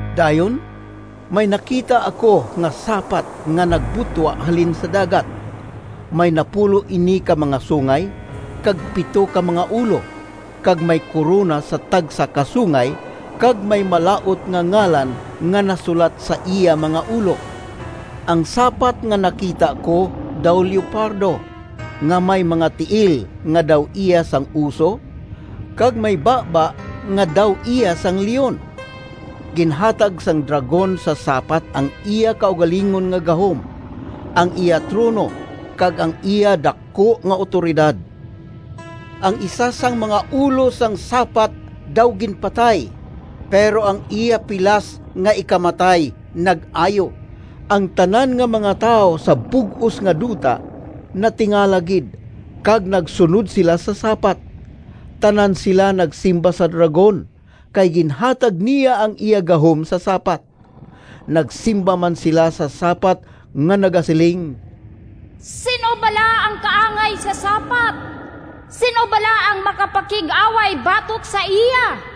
Dayon may nakita ako nga sapat nga nagbutwa halin sa dagat. May napulo ini ka mga sungay, kag pito ka mga ulo, kag may korona sa tagsa ka sungay, kag may malaut nga ngalan nga nasulat sa iya mga ulo. Ang sapat nga nakita ko daw leopardo, nga may mga tiil nga daw iya sang oso, kag may baba nga daw iya sang leon. Ginhatag sang dragon sa sapat ang iya kaugalingon nga gahom, ang iya trono, kag ang iya daku nga awtoridad. Ang isa sang mga ulo sang sapat daw ginpatay, pero ang iya pilas nga ikamatay nag-ayo. Ang tanan nga mga tawo sa bug-os nga duta natingala gid kag nagsunod sila sa sapat. Tanan sila nagsimba sa dragon, kay ginhatag niya ang iya gahom sa sapat. Nagsimba man sila sa sapat nga nagasiling, “Sin-o bala ang kaangay sa sapat? Sin-o bala ang makapakig-away batok sa iya?”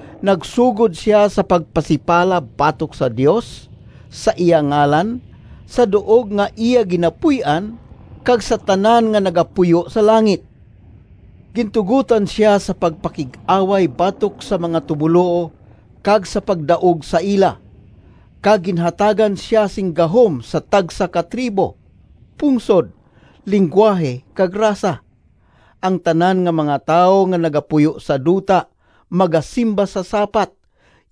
Nagsugod sia sa pagpasipala batok sa Dios, sa iya ngalan, sa duog nga iya ginapuy-an, kag sa tanan nga nagapuyo sa langit. Gintugotan sia sa pagpakig-away batok sa mga tumoluo kag sa pagdaog sa ila, kag ginhatagan sia sing gahom sa tagsa ka tribo, pungsod, linggwahe, kag rasa. Ang tanan nga mga tawo nga nagapuyo sa duta magasimba sa sapat,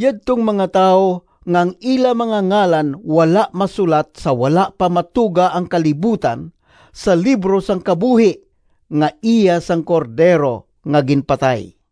yadtong mga tawo nga ang ila mga ngalan wala masulat sa wala pa matuga ang kalibutan sa libro sang kabuhi, nga iya sang Cordero nga ginpatay.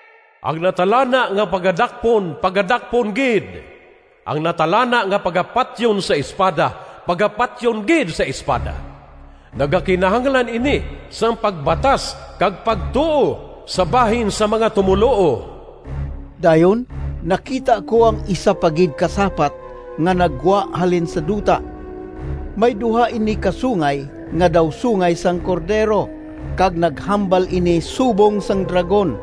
Ang natalana nga pagadakpon, pagadakpon gid. Ang natalana nga pagapatyon sa espada, pagapatyon gid sa espada. Nagakinahanglan ini sang pagbatas kag pagtuo sa bahin sang mga tumoluo.” Dayon nakita ko ang isa pa gid ka sapat nga naggwa halin sa duta. May duha ini ka sungay nga daw sungay sang cordero, kag naghambal ini subong sang dragon.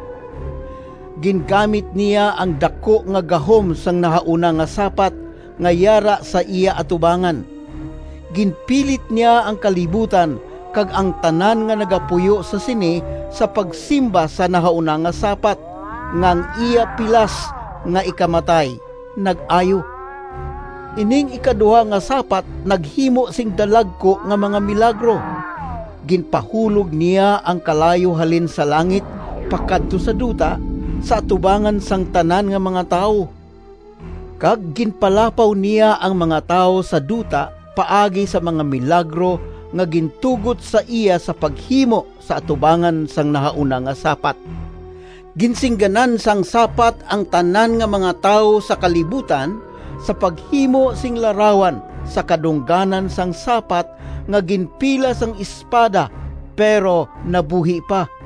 Gingamit niya ang daku nga gahom sang nahauna nga sapat nga yara sa iya atubangan. Ginpilit niya ang kalibutan kag ang tanan nga nagapuyo sa sini sa pagsimba sa nahauna nga sapat, nga ang iya pilas nga ikamatay nag-ayo. Ining ikaduha nga sapat naghimo sing dalagku nga mga milagro. Ginpahulog niya ang kalayo halin sa langit pakadto sa duta, sa atubangan sang tanan nga mga tawo. Kag ginpalapaw niya ang mga tawo sa duta paagi sa mga milagro nga gintugot sa iya sa paghimo sa atubangan sang nahauna nga sapat. Ginsingganan sang sapat ang tanan nga mga tawo sa kalibutan sa paghimo sing larawan sa kadungganan sang sapat nga ginpilas sang espada, pero nabuhi pa.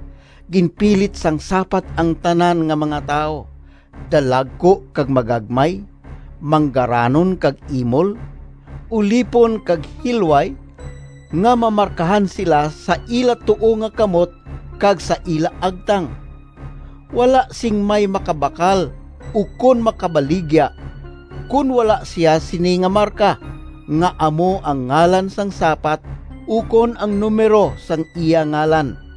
Ginpilit sang sapat ang tanan nga mga tawo, dalagku kag magagmay, manggaranon kag imol, ulipon kag hilway, nga mamarkahan sila sa ila tuo nga kamot kag sa ila agtang. Wala sing may makabakal ukon makabaligya, kon wala sia sini nga marka, nga amo ang ngalan sang sapat ukon ang numero sang iya ngalan.